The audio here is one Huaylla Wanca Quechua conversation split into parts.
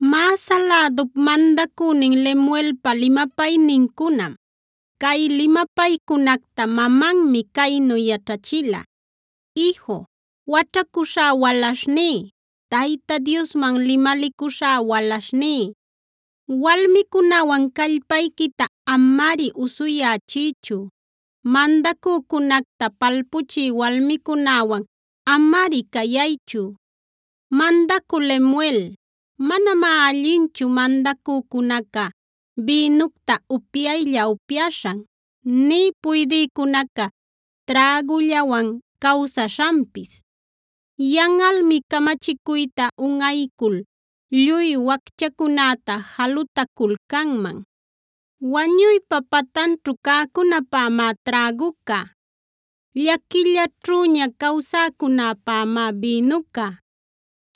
Masa lädup mandacünin Lemuelpa limapaynincunam; cay limapaycunacta mamanmi caynu yaćhachila: Iju, waćhacuśhá walaśhní, Tayta Diosman limalicuśhá walaśhní, walmicunäwan callpayquita amari usuyächiychu; mandacücunacta palpuchï walmicunäwan amari cayaychu. Mandacü Lemuel, manamá allinchu mandacücunaca bïnucta upyaylla-upyaśhan, nï puydïcunaca trägullawan cawsaśhanpis. Yanꞌalmi camachicuyta unꞌaycul lluy wacchacunäta jalutaculcanman. Wañuypa patanćhu cäcunäpämá träguca; llaquillaćhüña cawsäcunäpämá bïnuca.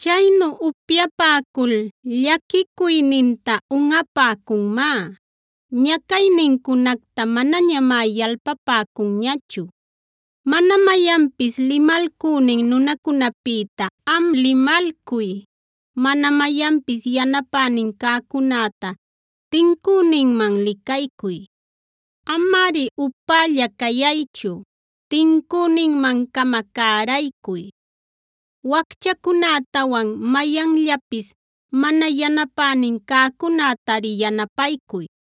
Chaynu upyapäcul llaquicuyninta unꞌapäcunmá; ñacaynincunacta manañamá yalpapäcunñachu. Mana mayanpis limalcünin nunacunäpïta am limalcuy; mana mayanpis yanapänin cäcunäta tincüninman licaycuy. Amari upälla cayaychu; tincüninman-cama cäraycuy; wacchacunätawan mayanllapis mana yanapänin cäcunätari yanapaycuy.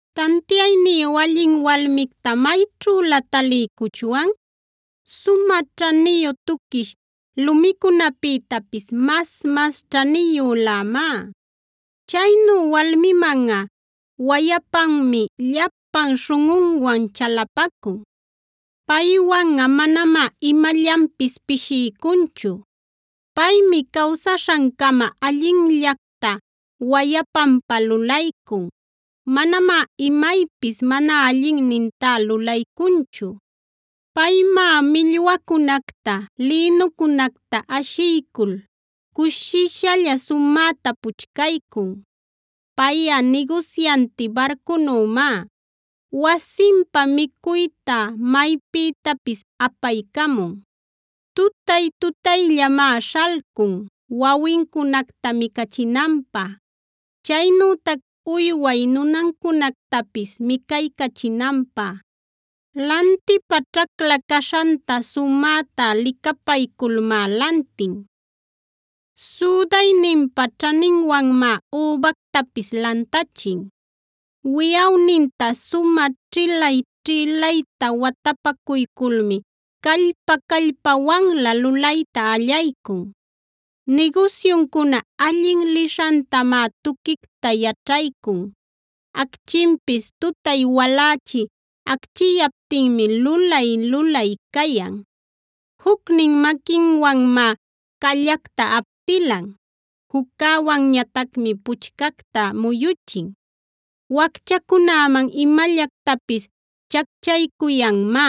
Tantiayniyu allin walmicta ¿mayćhülä taliycuchwan? Sumä ćhaniyu tuquish lumicunapïtapis mas-mas ćhaniyülämá. Chaynu walmimanꞌa wayapanmi llapan śhunꞌunwan chalapacun; paywanꞌa manamá imallanpis pishiycunchu. Paymi cawsaśhancama allinllacta wayapanpä lulaycun; manamá imaypis mana allinnintá lulaycunchu. Paymá millwacunacta, lïnucunacta ashiycul cushishalla sumäta puchcaycun. Payꞌa nigusyanti barcunümá, wasinpä micuyta maypïtapis apaycamun. Tutay-tutayllamá śhalcun wawincunacta micachinanpä, chaynütac uywaya nunancunactapis micaycachinanpä. Lantipä ćhacla caśhanta sumäta licapayculmá lantin; südayninpa ćhaninwanmá übactapis lantachin. Wiꞌawninta sumä ćhïlay-ćhïlayta watapacuyculmi callpa-callpawanlä lulayta allaycun. Nigusyuncuna allin lishantamá tuquicta yaćhaycun; acchinpis tutay walächi acchiyaptinmi lulay-lulay cayan. Jucnin maquinwanmá callacta aptilan, juccäwanñatacmi puchcacta muyuchin. Wacchacunäman imallactapis chacchaycuyanmá;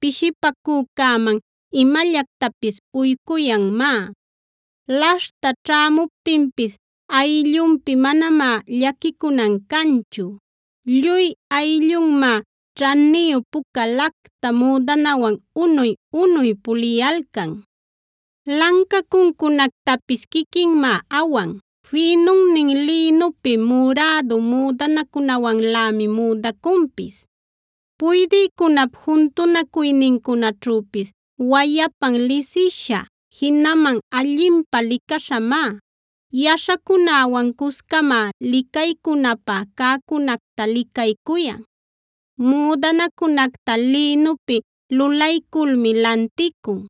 pishipacücäman imallactapis uycuyanmá. Laśhta ćhäcamuptinpis ayllunpi manamá llaquicunan canchu; lluy ayllunmá ćhaniyu puca lacta müdanawan unuy-unuy puliyalcan. Lancacuncunactapis quiquinmá awan; fïnunnin lïnupi, murädu müdanacunawanlämi müdacunpis. Puydïcunap juntunacuynincunaćhüpis wayapan lisisha, jinaman allinpä licaśhamá. Yaśhacunäwan cuscamá licaycunapä cäcunacta licaycuyan. Müdanacunacta lïnupi lulalculmi lanticun;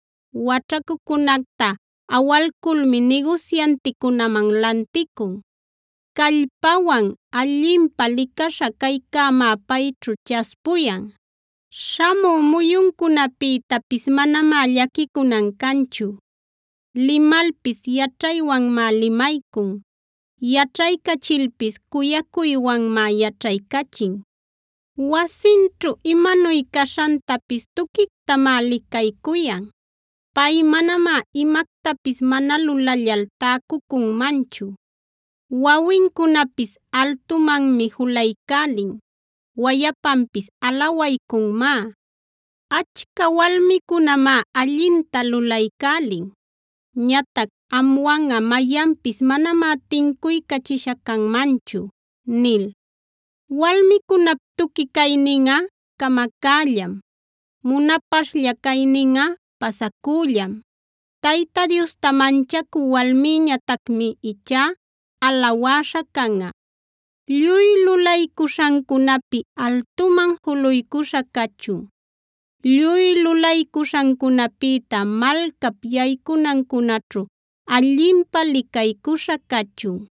waćhacucunacta awalculmi nigusyanticunäman lanticun. Callpawan, allinpä licaśha caycämá payćhu chaspuyan; śhamü muyuncunapïtapis manamá llaquicunan canchu. Limalpis yaćhaywanmá limaycun; yaćhaycachilpis cuyacuywanmá yaćhaycachin. Wasinćhu imanuy caśhantapis tuquictamá licaycuyan; pay manamá imactapis mana lulallal täcucunmanchu. Wawincunapis altumanmi julaycälin. Wayapanpis alawaycunmá: “Achca walmicunamá allinta lulaycälin. Ñatac amwanꞌa mayanpis manamá tincuycachisha canmanchu” nil. Walmicunap tuqui cayninꞌa camacällam, munapaśhlla cayninꞌa pasacüllam. Tayta Diosta manchacü walmïñatacmi ichá alawäśha canꞌa. Lluy lulaycuśhancunapi altuman juluycuśha cachun. Lluy luśhancunapïta malcap yaycunancunaćhu allinpä licaycuśha cachun.